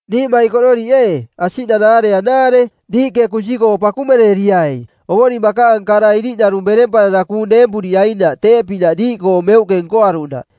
Niiꞌmaikororiꞌ ee, asiꞌnanaare anaare: Diiꞌke kunsi-koo pakumereriai Ovoring bakaang kara iriꞌnarung beremparara kuung deempuriainaꞌ teeꞌpinaꞌ diiꞌkoo meuꞌke nkoaruꞌnaꞌ.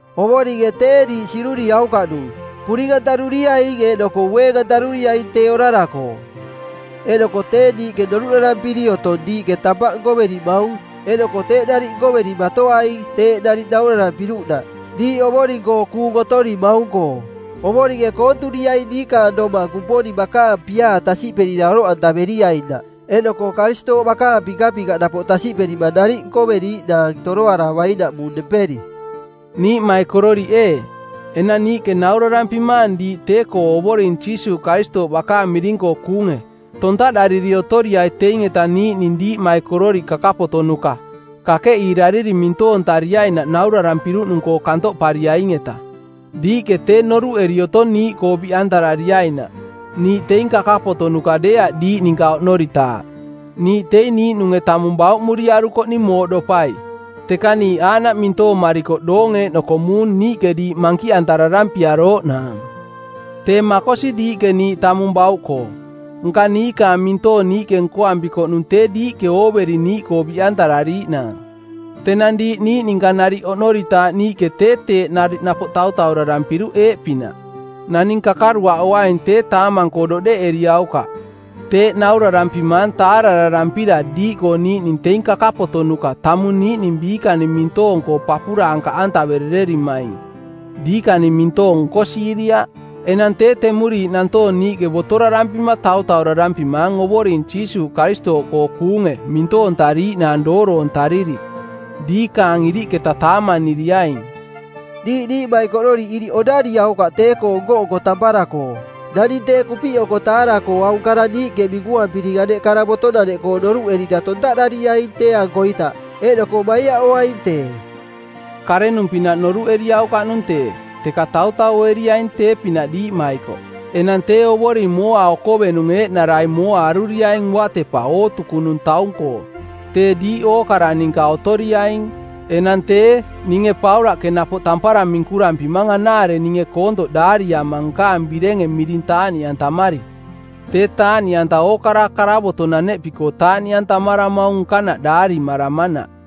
Ovoringe tee diiꞌ siꞌduriaukaꞌnung, puring-antaruriaing eeꞌnoko ueeng-antaruriaing tee orara-koo. Eeꞌnoko tee niiꞌke noruꞌdarampiri otong diiꞌke tampaꞌ nkoverimaung eeꞌnoko teeꞌ nariꞌ nkoverimatoaing teeꞌ nariꞌ naurarampiruꞌnaꞌ, diiꞌ Ovoring-koo kuung otorimaung-koo. Ovoringe koonturiaing diikaang domang Kumponing bakaang piaa tasiꞌperira oroꞌantaveriainaꞌ eeꞌnoko Karistooꞌ bakaang pinkapinkaꞌ napoꞌ tasiꞌperima nariꞌ nkoveriiꞌnaang toroaravainaꞌmung nemperi. Niiꞌmaikororiꞌ ee, enang niiꞌke naurarampimaang diiꞌ tee-koo Ovoring Jiisuuꞌ Karistooꞌ bakaang miring-koo kuunge: Tontaꞌdariri otoriai teing-eta niiꞌning diiꞌmaikororiꞌ kakapotonuka, kakeꞌiirariri mintoontariainaꞌ naurarampiruꞌnung-koo kantoꞌpariaing-eta. Diiꞌke tee noruꞌeri otong niiꞌkoo biꞌantarariainaꞌ. Niiꞌ teing kakapotonuka deeaꞌ diiꞌ ninka oꞌnoritaaꞌ Niiꞌ teing niiꞌnunge tamung bauꞌmuriarukoꞌning mooꞌdopai, teka niiꞌ aaꞌnaꞌ mintoomarikoꞌ doong eeꞌnoko muung niiꞌke diiꞌ mankiꞌantararampiarooꞌnaang. Tee makosi diiꞌke niiꞌ tamung bauꞌkoo, nka niikaang mintoong niiꞌke nkoampikoꞌnung tee diiꞌke ooveri niiꞌkoo biꞌantarariiꞌnaang. Tenang diiꞌ niiꞌ ninka nariꞌ oꞌnoritaaꞌ niiꞌke tee teeꞌ nariꞌ napoꞌ tautaurarampiruꞌ eeꞌpinaꞌ: Naning kakaruaꞌoaing tee taamang-koo doꞌdeꞌeriaukaꞌ. Teeꞌ naurarampimaang taarararampira diiꞌkoo niiꞌning teing kakapotonuka tamung niiꞌning biikaning mintoong-koo papuraankaꞌantaverererimaing, diikaning mintoong nkosiiriaꞌ. Enang tee temuriiꞌ nantoong niiꞌke botorarampima tautaurarampimaang Ovoring Jiisuuꞌ Karistooꞌkoo kuunge mintoontariiꞌnaang dooroontariri. Diikaang iriꞌketaꞌ taamaniriaing. Diiꞌ niiꞌmaikororiꞌ iriꞌ oꞌdariaukaꞌ tee-koo nko-nko tampara-koo. Naning tee kupiꞌoko taara-koo aung kara niiꞌke minkuampiring aneꞌ karavotonaneꞌkoo noruꞌerira tontaꞌdariaing tee-ankoita, eeꞌnoko maiaꞌoaing tee. Karenung pinaꞌ noruꞌeriaukaꞌnung tee, teka tautaueriaing tee-pinaꞌ diiꞌmaikoꞌ. Enang tee Ovoring mooa okovenung eeꞌnarai mooa aruriaing uatepa ootukunung taung-koo. Tee diiꞌ ookara ninka otoriaing. Enang tee, ninge Paulaꞌke napoꞌ tampara minkurampimang anaare ninge koontoꞌ daariama nkaang birenge miring taaꞌniꞌantamari. Tee taaꞌniꞌanta ookara karavotonaneꞌpi-koo taaꞌniꞌantamaramaung nkanaꞌ daarimaramanaꞌ.